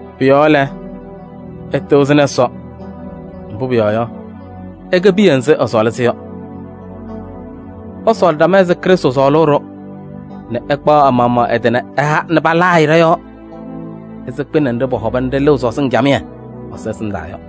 Pʋ-yɔɔ lɛ, ɩtɩɣzɩnɩ Ɛsɔ, mbʋ pʋyɔɔ yɔ, ɩkɛ piya nzɩ ɛsɔɔlɩ-sɩ yɔ. Ɩsɔɔlɩ ɖama ɛzɩ Krɩstʋ sɔɔlʋʋ-ɖʋ nɛ ɛkpaɣ ɛ-maɣmaɣ ɛ-tɩ ɛha nɛ palaa-ɩ ɖɔ-yɔɔ ɛzɩ kpɩnɛ nɖɩ pɔhɔba nɛ ɖɩlɩɣ sɔzɩŋ camɩyɛ Ɛsɔ ɛsɩndaa yɔ.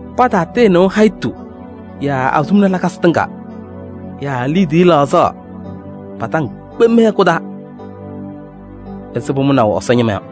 Pataatɩɩnɩʋ hayitu yaa azuluma lakasɩ tɩŋa yaa liidiye laɣzaɣ pa-taŋ kpem mɩ-hɛkʋ taa ɛzɩ pʋmʋnaʋ Ɛsɔ ñɩma yɔ.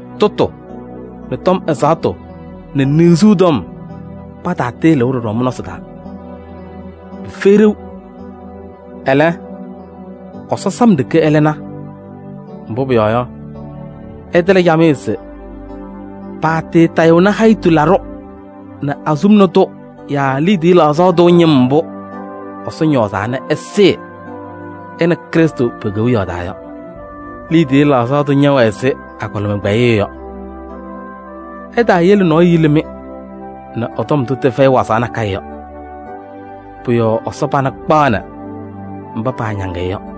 Tʋtʋ nɛ tɔm ɛzaɣtʋ nɛ niɣzuu tɔm, pataatɩɩlɩʋ ɖɔɖɔ mɩ-nɔɔ taa: pɩfɛyɩ ɖeu. Ɛlɛ, Ɛsɔ sam ɖeke ɛlɩna. Mbʋ pʋyɔɔ yɔ, ɩtɩlɩ camɩyɛ se paatɩɩtayɩɣnɩ hayitu laɖʋ nɛ azuluma tʋ yaa liidiye laɣzaɣ tʋ ñɩm mbʋ Ɛsɔ ñɔɔzaa nɛ ɛsɩɩ ɛ nɛ Krɩstʋ pe-Kewiyaɣ taa yɔ. Liidiye laɣzaɣ tʋ ñɛwɛ ɛzɩ agɔlɩma kpɛyɩyʋ yɔ. Ɩtaayele nɔɔyʋ yili-mɩ nɛ ɛ-tɔm ndʋ tɩfɛyɩ wazaɣ nakɛyɛ yɔ: pʋ-yɔɔ Ɛsɔ pana kpaɣnɩ mba paañaŋ-ɩ yɔ.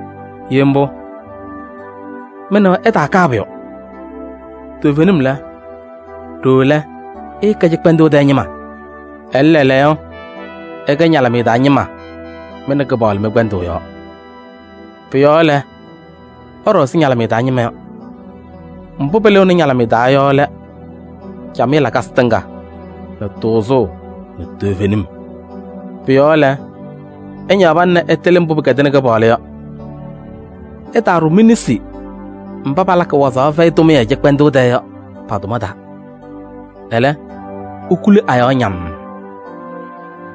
Ye mbʋ, mɩ nɛ wɛ ɩtaakaa pʋyʋ. Toovenim lɛ, ɖooo lɛ ɩɩkɛ cɩkpɛndʋʋ tɛɛ ñɩma. Ɛlɛ, lɛɛlɛɛyɔ ɩkɛ ñalɩmɩyɛ taa ñɩma mɩ nɛ Kɩpaɣlʋ mɩ-kpɛndʋʋ yɔɔ. Pʋ-yɔɔ lɛ, ɩɖɔ ɛzɩ ñalɩmɩyɛ taa ñɩma yɔ. Mbʋ pɩlɩɣnɩ ñalɩmɩyɛ taa yɔ lɛ: camɩyɛ lakasɩ tɩŋa nɛ tʋʋzʋʋ nɛ toovenim. Pʋ-yɔɔ lɛ, ɩñaɣ pana nɛ ɩtɩlɩ mbʋ pɩkɛdɩnɩ Kɩpaɣlʋ yɔ. Ɩtaaɖʋ mi-nesi mba palakɩ wazaɣ fɛyɩ tʋmɩyɛ cɩkpɛndʋʋ tɛɛ yɔ pa-tʋma taa. Ɛlɛ, ikuli a-yɔɔ ñammm.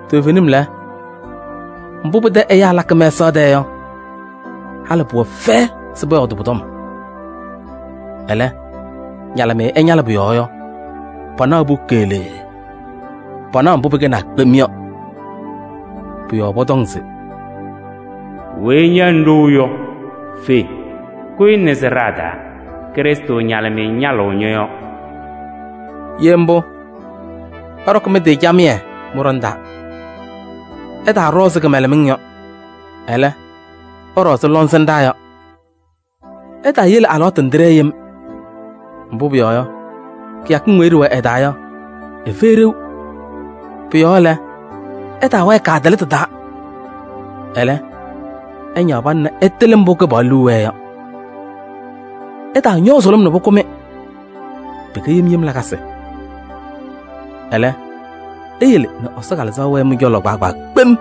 Toovenim lɛ, mbʋ pɩtɛ ɛyaa lakɩ mɛsaɣ tɛɛ yɔ, halɩ pʋwɛ fɛyɛ se pɔyɔɔdɩ pʋ-tɔm. Ɛlɛ, ñalɩmɩyɛ ɛñalɩ pʋ-yɔɔ yɔ, panaɣ-pʋ keɣlee, panaɣ mbʋ pɩkɛnaa kpem yɔ. Pʋ-yɔɔ pɔtɔŋ se: “Weyi ña ŋɖou yɔ, fe, kʋyɩ nɛ sɩɖaa taa, Krɩstʋ ñalɩmɩyɛ ñalɩɣ ñɔ-yɔɔ.” Ye mbʋ, ɩɖɔkɩ mɩ-tɩ camɩyɛ mɩ-ɖɔnɛ taa. Ɩtaaɖɔ ɛzɩ kɩmɛlɛmɩŋ yɔ, ɛlɛ, ɩɖɔ ɛzɩ lɔŋsɩnɖaa yɔ. Ɩtaayele alɩwaatʋ nɛ tɩɖɛɛ yem, mbʋ pʋyɔɔ yɔ, kɩyakɩŋ weyi ɖɩwɛ ɩ-taa yɔ, ɩfɛyɩ ɖeu. Pʋ-yɔɔ lɛ, ɩtaawɛɛ kaatɩlɩtʋ taa, ɛlɛ, ɩñaɣ pana nɛ ɩtɩlɩ mbʋ Kɩpaɣlʋ liu wɛɛ yɔ. Ɩtaañɔɔ sʋlʋm nɛ pʋkʋ-mɩ: pɩkɛ yem yem lakasɩ. Ɛlɛ, iyele nɛ Ɛsɔ Kalɩzaɣ wɛɛ mɩ-cɔlɔ kpaagbaa kpem.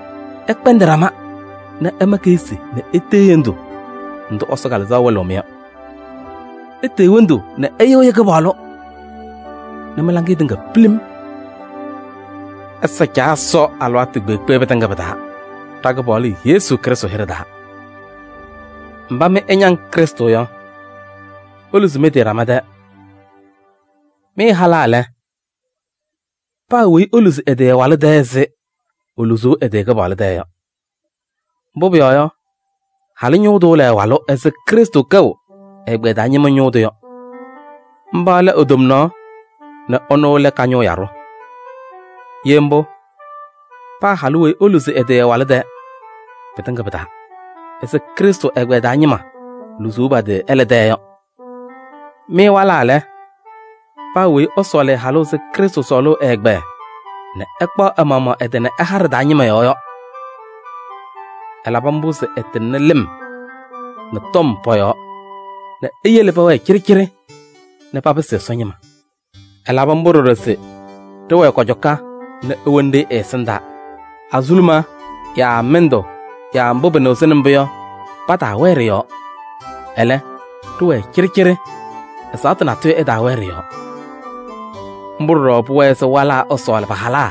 Ɩkpɛndɩ ɖama nɛ ɩma keɣsi nɛ itee hendu ndʋ Ɛsɔ Kalɩzaɣ wɩlɩɣ-mɩ yɔ. Itee hendu nɛ ɩyɩɣyɩ Kɩpaɣlʋ nɛ mɩ-laŋɩyɛ tɩŋa pilim. Ɩsa Caa Ɛsɔ alɩwaatʋ kpeekpe pɩtɩŋa pɩ-taa ɖa-Kɩpaɣlʋ Yesu Krɩstʋ hɩɖɛ taa. Mba mɩ ɩñaŋ Krɩstʋ yɔ, iluzi mɩ-tɩ ɖama tɛɛ. Mɩ halaa lɛ, paa weyi eluzi ɛ-tɩ ɛ-walʋ tɛɛ ɛzɩ eluzuu ɛ-tɩ Kɩpaɣlʋ tɛɛ yɔ. Mbʋ pʋyɔɔ yɔ, halʋ ñʋʋ tʋ lɛ ɛ-walʋ ɛzɩ Krɩstʋ kɛʋ ɛ-ɛgbɛyɛ taa ñɩma ñʋʋ tʋ yɔ. Mba lɛ e-tomnaɣ nɛ ɛnʋ lɛ ka-ñʋʋ yaɖʋ. Ye mbʋ, paa halʋ weyi eluzi ɛ-tɩ ɛ-walʋ tɛɛ pɩtɩŋa pɩ-taa ɛzɩ Krɩstʋ ɛgbɛyɛ taa ñɩma luzuu pa-tɩ ɛlɛ tɛɛ yɔ. Mɩ walaa lɛ, paa weyi ɛsɔɔlɩ ɛ-halʋ ɛzɩ Krɩstʋ sɔɔlʋʋ ɛ-ɛgbɛyɛ nɛ ɛkpaɣ ɛ-maɣmaɣ ɛ-tɩ nɛ ɛha ɖɩ-taa ñɩma yɔɔ yɔ. Ɛlabɩ mbʋ se ɛtɩŋnɩ lɩm nɛ tɔm pɔ-yɔɔ nɛ eyele pɛwɛɛ cɩɖɩcɩɖɩ nɛ papɩsɩ Ɛsɔ ñɩma. Ɛlabɩ mbʋ ɖɔɖɔ se ɖɩwɛɛ kɔcɔka nɛ ewoni-ɖɩ ɛ-ɛsɩndaa, azuluma yaa mɩndʋ yaa mbʋ pɩnɩɣzɩnɩ mbʋ yɔ, pataawɛɛ ɖɩ-yɔɔ, ɛlɛ, ɖɩwɛɛ cɩɖɩcɩɖɩ, ɛzaɣtʋ natʋyʋ ɛtaawɛɛ ɖɩ-yɔɔ. Mbʋ ɖɔɖɔ pʋwɛɛ se walaa ɛsɔɔlɩ pa-halaa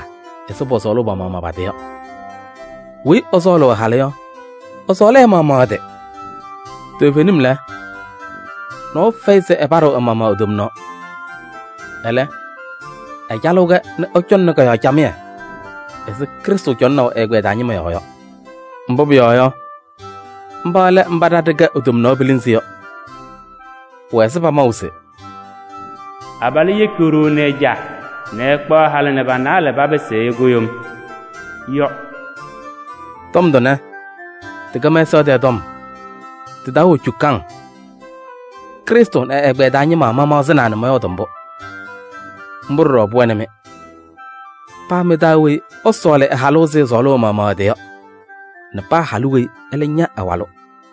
ɛzɩ pɔsɔɔlʋʋ pa-maɣmaɣ pa-tɩ yɔ: weyi ɛsɔɔlɩ ɛ-halʋ yɔ, ɛsɔɔlɩ ɛ-maɣmaɣ ɛ-tɩ. Toovenim lɛ, nɔɔyʋ fɛyɩ se ɛpaɖɩɣ ɛ-maɣmaɣ e-tomnaɣ. Ɛlɛ, ɛcalɩɣ-kɛ nɛ ɛcɔŋnɩ kɔ-yɔɔ camɩyɛ ɛzɩ Krɩstʋ cɔŋʋʋnɩ ɛ-ɛgbɛyɛ taa ñɩma yɔɔ yɔ. Mbʋ pʋyɔɔ yɔ, mba lɛ mba ɖa ɖɩkɛ e-tomnaɣ pilinzi yɔ. Pʋwɛ ɛzɩ pamaʋ se: “Abalʋ yeki ɛ-caa nɛ e-ɖoo nɛ ɛkpaɣ halʋ nɛ pa-naalɛ papɩsɩ ɛyʋ kʋɖʋm” yɔ. Tɔm tʋnɛ, tɩkɛ mɛsaɣ tɛɛ tɔm, tɩ-taa wɛ cukaŋ. Krɩstʋ nɛ ɛ-ɛgbɛyɛ taa ñɩma mamaɣzɩnaa nɛ mɔyɔɔdɩ mbʋ. Mbʋ ɖɔɖɔ pʋwɛnɩ-mɩ: paa mɩ-taa weyi ɛsɔɔlɩ ɛ-halʋ ɛzɩ ɛsɔɔlʋʋ ɛ-maɣmaɣ ɛ-tɩ yɔ nɛ paa halʋ weyi ɛlɛ ña ɛ-walʋ.